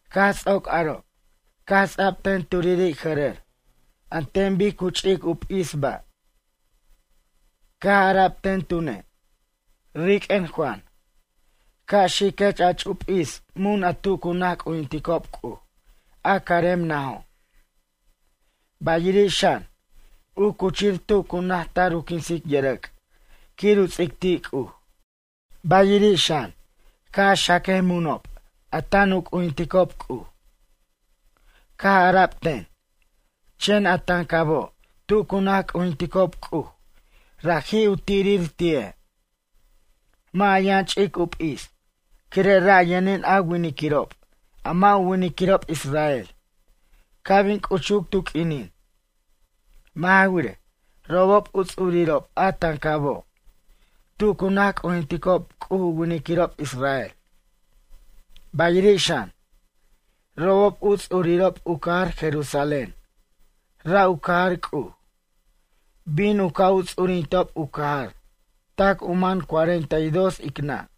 Caj ts'oc aro', caj ts'a'b ten turiri' jʌrʌr an ten bic cu ch'ic u p'is ba'. Caj ara'b ten tune': ―Riq'uen Juan, ca' xiquech a ch'u p'is mun a tu cu naj c'ujinticob C'uj, a carem najo'. Bayiri' xan, u cuchir tu cu naj tar u quinsic yʌrʌc' quir u ts'ic ti' C'uj. Bayiri' xan, ca' a xaquej munob a tan u c'ujinticob C'uj ―caj ara'b ten―. Chen a tancabo' tu cu naj c'ujinticob C'uj, raji' u tirir ti'e'. Mʌ' a yʌn ch'ic u p'is, quire' ra' yʌnin a winiquirob a mʌ' u winiquirob israel, ca' bin c'uchuc tu q'uinin. Mʌ' ja wirej, robob u ts'urirob a tancabo', tu cu naj c'ujinticob C'uj u winiquirob israel. Bayiri' xan, robob u ts'urirob u cajar Jerusalén, ra' u cajar C'uj. Bin u ca' u ts'urintob u cajar tac u man cuarenta y dos ic nʌ'.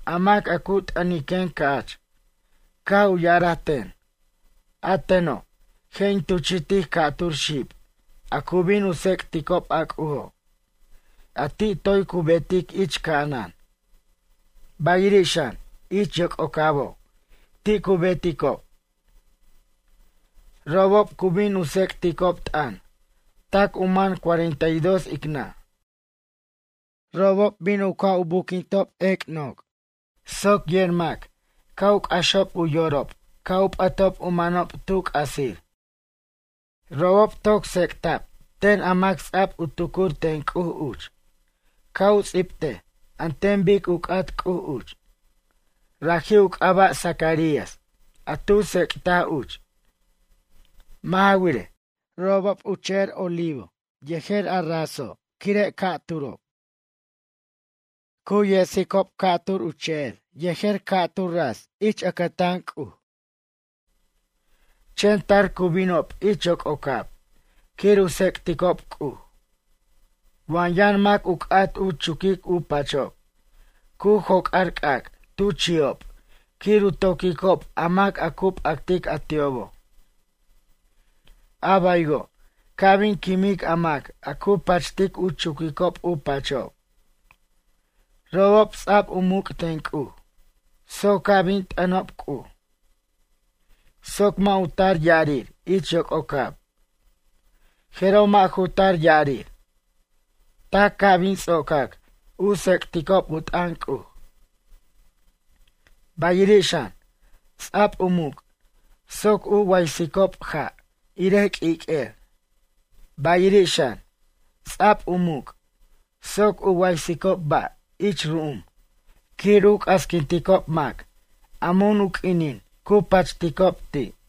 A mac a cu t'ʌniquen ca'ch, caj u ya'araj ten: “A teno', je' in tuchi'tic ca'tur xib a cu bin u tsec'ticob a C'ujo' a ti' toy cu betic ich ca'anan, bayiri' xan ich yoc'ocabo' ti' cu beticob. Robob cu bin u tsec'ticob t'ʌn tac u man cuarenta y dos ic nʌ'. Robob bin u ca' u buquintob ec' noc' soc yer mac ca' u c'axob u yorob ca' u p'ʌtob u manob tu c'asir.” Robob toc tsec'ta'b ten a mac ts'a'b u tucur ten C'uj uch ca' u ts'ibtej an ten bic u c'at C'uj uch. Raji' u c'aba' Zacarías a tu tsec'taj uch. Mʌ' ja wirej, robob u che'er oliva yejer a raso' quire' ca'turo'. Cu yets'icob ca'tur u che'er yejer ca'tur ras ich ʌcʌtan C'uj. Chen tar cu binob ich yoc'ocab quir u tsec'ticob C'uj. Wa yʌn mac u c'at u chuquic u pachob, cu joc'ar c'ac' tu chi'ob quir u toquicob a mac a cu p'actic a ti'obo'. A baywo' ca' bin quimic a mac a cu pachtic u chuquicob u pachob. Robob ts'a'b u muc' ten C'uj soc ca' bin t'ʌnob C'uj soc mʌ' u tar ya'arir ich yoc'ocab, jeroj mʌ' ju tar ya'arir tac ca' bin ts'ocac u tsec'ticob u t'ʌn C'uj. Bayiri' xan, ts'a'b u muc' soc u waysicob ja' irej q'uiq'uer. Bayiri' xan, ts'a'b u muc' soc u waysicob ba' ich ru'um quir u c'asquinticob mac a mun u q'uinin cu pachticob ti'.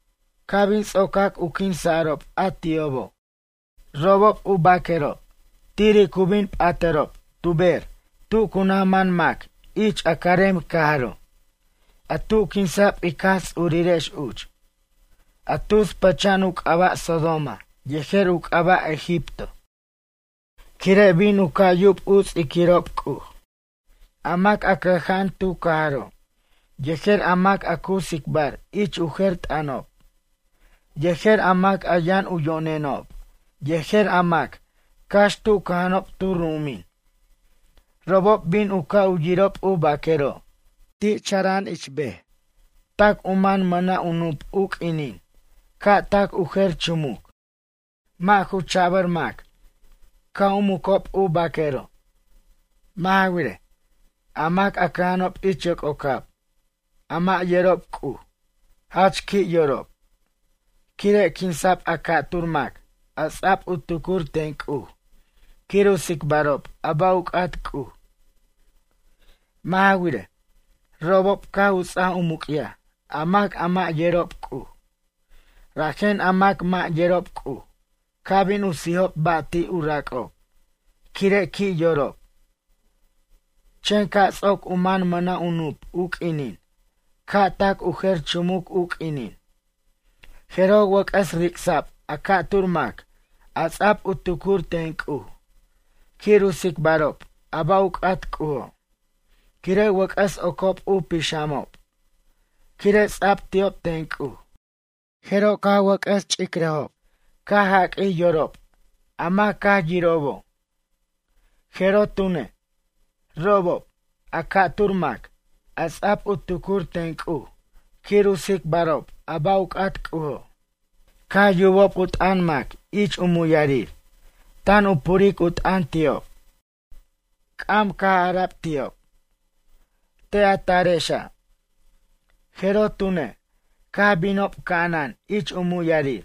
Ca' bin ts'ocac u quinsa'rob a ti'obo', robob u baquerob tiri' cu bin p'atʌrob tu ber tu cu naj man mac ich a carem cajaro', a tu quinsa'b ic Jaj Ts'urirex uch, a tus pʌcha'an u c'aba' Sodoma yejer u c'aba' Egipto, quire' bin u ca' yub u ts'iquirob C'uj. A mac a cʌja'an tu cajaro', yejer a mac a cu tsicbar ich u jer t'ʌnob, yejer a mac a yʌn u yo'nenob, yejer a mac cax tu cʌja'anob tu ru'umin, robob bin u ca' u yirob u baquero' ti' chara'an ich ber tac u man mʌna' u nup' u q'uinin ca' tac u jer chumuc. Mʌ' ju ch'abʌr mac ca' u mucob u baquerob. Mʌ' ja wirej, a mac a cʌja'anob ich yoc'ocab, a mʌ' yerob C'uj, jach qui' yorob, quire' quinsa'b a ca'tur mac a ts'a'b u tucur ten C'uj quir u tsicbarob a ba' u c'at C'uj. Mʌ' ja wirej, robob caj u ts'aj u muc'yaj a mac a mʌ' yerob C'uj, rajen a mac mʌ' yerob C'uj caj bin u sijob ba' ti' u rac'ob quire' qui' yorob. Chen ca' ts'oc u man mʌna' u nup' u q'uinin ca' tac u jer chumuc u q'uinin, jeroj wʌc'ʌs ric'sa'b a ca'tur mac a ts'a'b u tucur ten C'uj quir u tsicbarob a ba' u c'at C'ujo', quire' wʌc'ʌs ocob u pixamob, quire' ts'a'b ti'ob ten C'uj. Jeroj caj wʌc'ʌs ch'icrarob, caj jaq'uij yorob a mac caj yirobo'. Jeroj tune', robob, a ca'tur mac, a ts'a'b u tucur ten C'uj quir u tsicbarob a ba' u c'at C'ujo', caj yubob u t'ʌn mac ich u muyarir, tan u puric u t'ʌn ti'ob. C'am caj ara'b ti'ob: ―Te' a tarexa'. Jeroj tune', caj binob ca'anan ich u muyarir.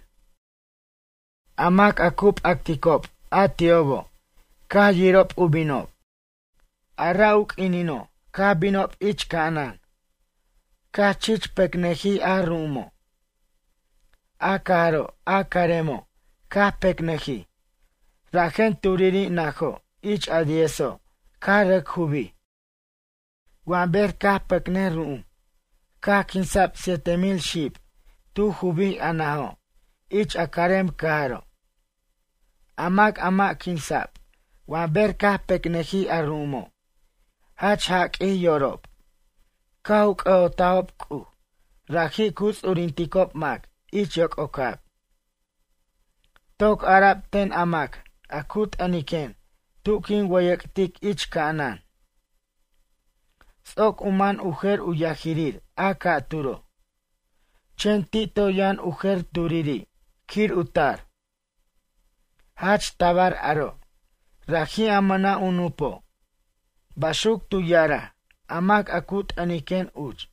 A mac a cu p'acticob a ti'obo' caj yirob u binob. A ra' u q'uinino' caj binob ich ca'anan, caj chich pecnʌjij a ru'umo'. A cajaro' a caremo', caj pecnʌjij, rajen turiri' najo' ich a diezo' caj rʌc jubij. Wa ber caj pecnʌj ru'um caj quinsa'b siete mil xib tu jubij a najo' ich a carem cajaro'. A mac a mʌ' quinsa'b wa ber caj pecnʌjij a ru'umo' jach jaq'uij yorob, caj u c'ʌ'otajob C'uj raji' cu ts'urinticob mac ich yoc'ocab. Toc ara'b ten a mac a cu t'ʌniquen tu quin wʌyʌc'tic ich ca'anan: ―Ts'oc u man u jer u yajirir a ca'turo'. Chen ti' toy yʌn u jer turiri' quir u tar. Jach tabar aro', raji' a mʌna' u nup'o'. Baxuc tu ya'araj a mac a cu t'ʌniquen uch.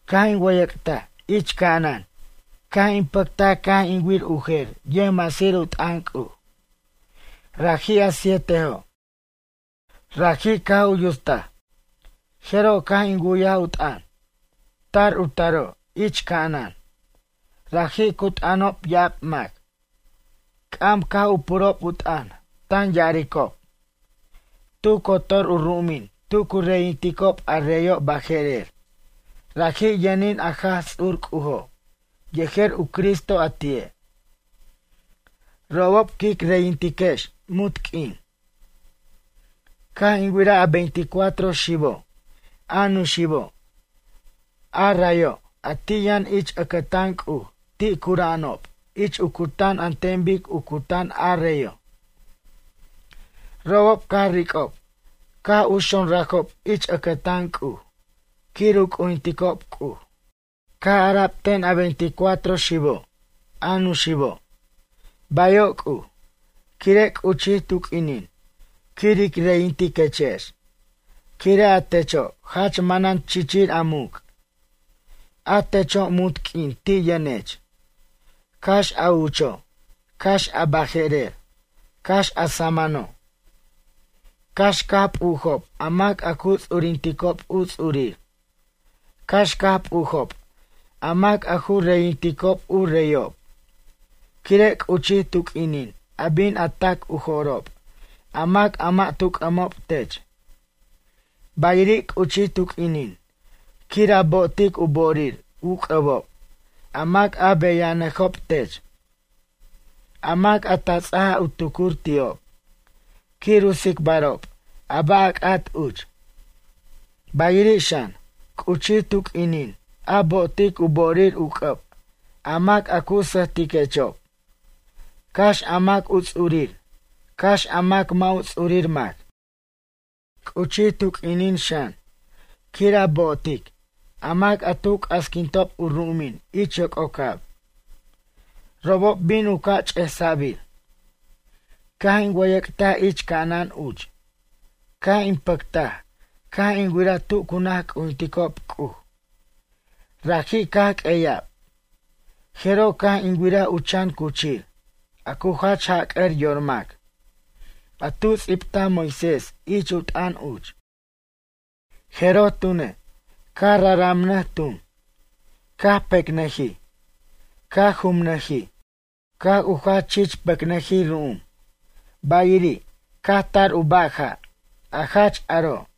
Caj in wʌyʌc'taj ich ca'anan caj in pʌctaj caj in wir u jer yʌjmasir u t'ʌn C'uj. Raji' a sietojo'. Raji' caj u yutst, jeroj caj in wu'yaj u t'ʌn, tar u taro' ich ca'anan. Raji' cu t'ʌnob ya'ab mac. C'am caj u purob u t'ʌn tan ya'aricob: Tu cotor u ru'umin tu cu reyinticob a reyo' baje'rer, raji' yʌnin a Jaj Ts'ur C'ujo' yejer u Cristo a ti'e'. Robob quic reyintiquex munt q'uin. Caj in wiraj a veinticuatro xibo', a nuxibo', a rayo' a ti' yʌn ich ʌcʌtan C'uj ti' cura'anob ich u cutan an ten bic u cutan a reyo'. Robob caj ric'ob caj u xonrajob ich ʌcʌtan C'uj quir u c'ujinticob C'uj. Caj ara'b ten a veinticuatro xibo', a nuxibo': Bayo' C'uj, quire' c'uchij tu q'uinin quir ic reyintiquechex quire' a techo' jach manan chichir a muc'. A techo' munt q'uin ti' yʌnech, cax a ucho', cax a baje'rer, cax a samʌno'. Cax caj p'ujob a mac a cu ts'urinticob u ts'urir, cax caj p'ujob a mac a ju reyinticob u reyob, quire' c'uchij tu q'uinin a bin a ta'c u jo'rob a mac a mʌ' tu c'ʌmob tech. Bayiri' c'uchij tu q'uinin quir a bo'otic u bo'orir u c'ʌbob a mac a beyajnʌjob tech, a mac a ta ts'aj a tucur ti'ob quir u tsicbarob a ba' a c'at uch. Bayiri' xan, c'uchij tu q'uinin a bo'otic u bo'orir u c'ʌb a mac a cu sʌjtiquechob, cax a mac u ts'urir, cax a mac mʌ' u ts'urir mac. C'uchij tu q'uinin xan, quir a bo'otic a mac a tu c'asquintob u ru'umin ich yoc'ocab, robob bin u ca' ch'esa'bir. Caj in wʌyʌc'taj ich ca'anan uch, caj in pʌctaj caj in wiraj tu cu naj c'ujinticob C'uj, raji' caj q'ueya'b, jeroj caj in wiraj u chan cuchir, a cu jach jac'ʌr yor mac, a tu ts'ibtaj Moisés ich u t'ʌn uch. Jeroj tune', caj raramnʌj tun, caj pecnʌjij, caj jumnʌjij, caj u jach chich pecnʌjij ru'um, bayiri', caj tar u ba' ja', a jach aro'.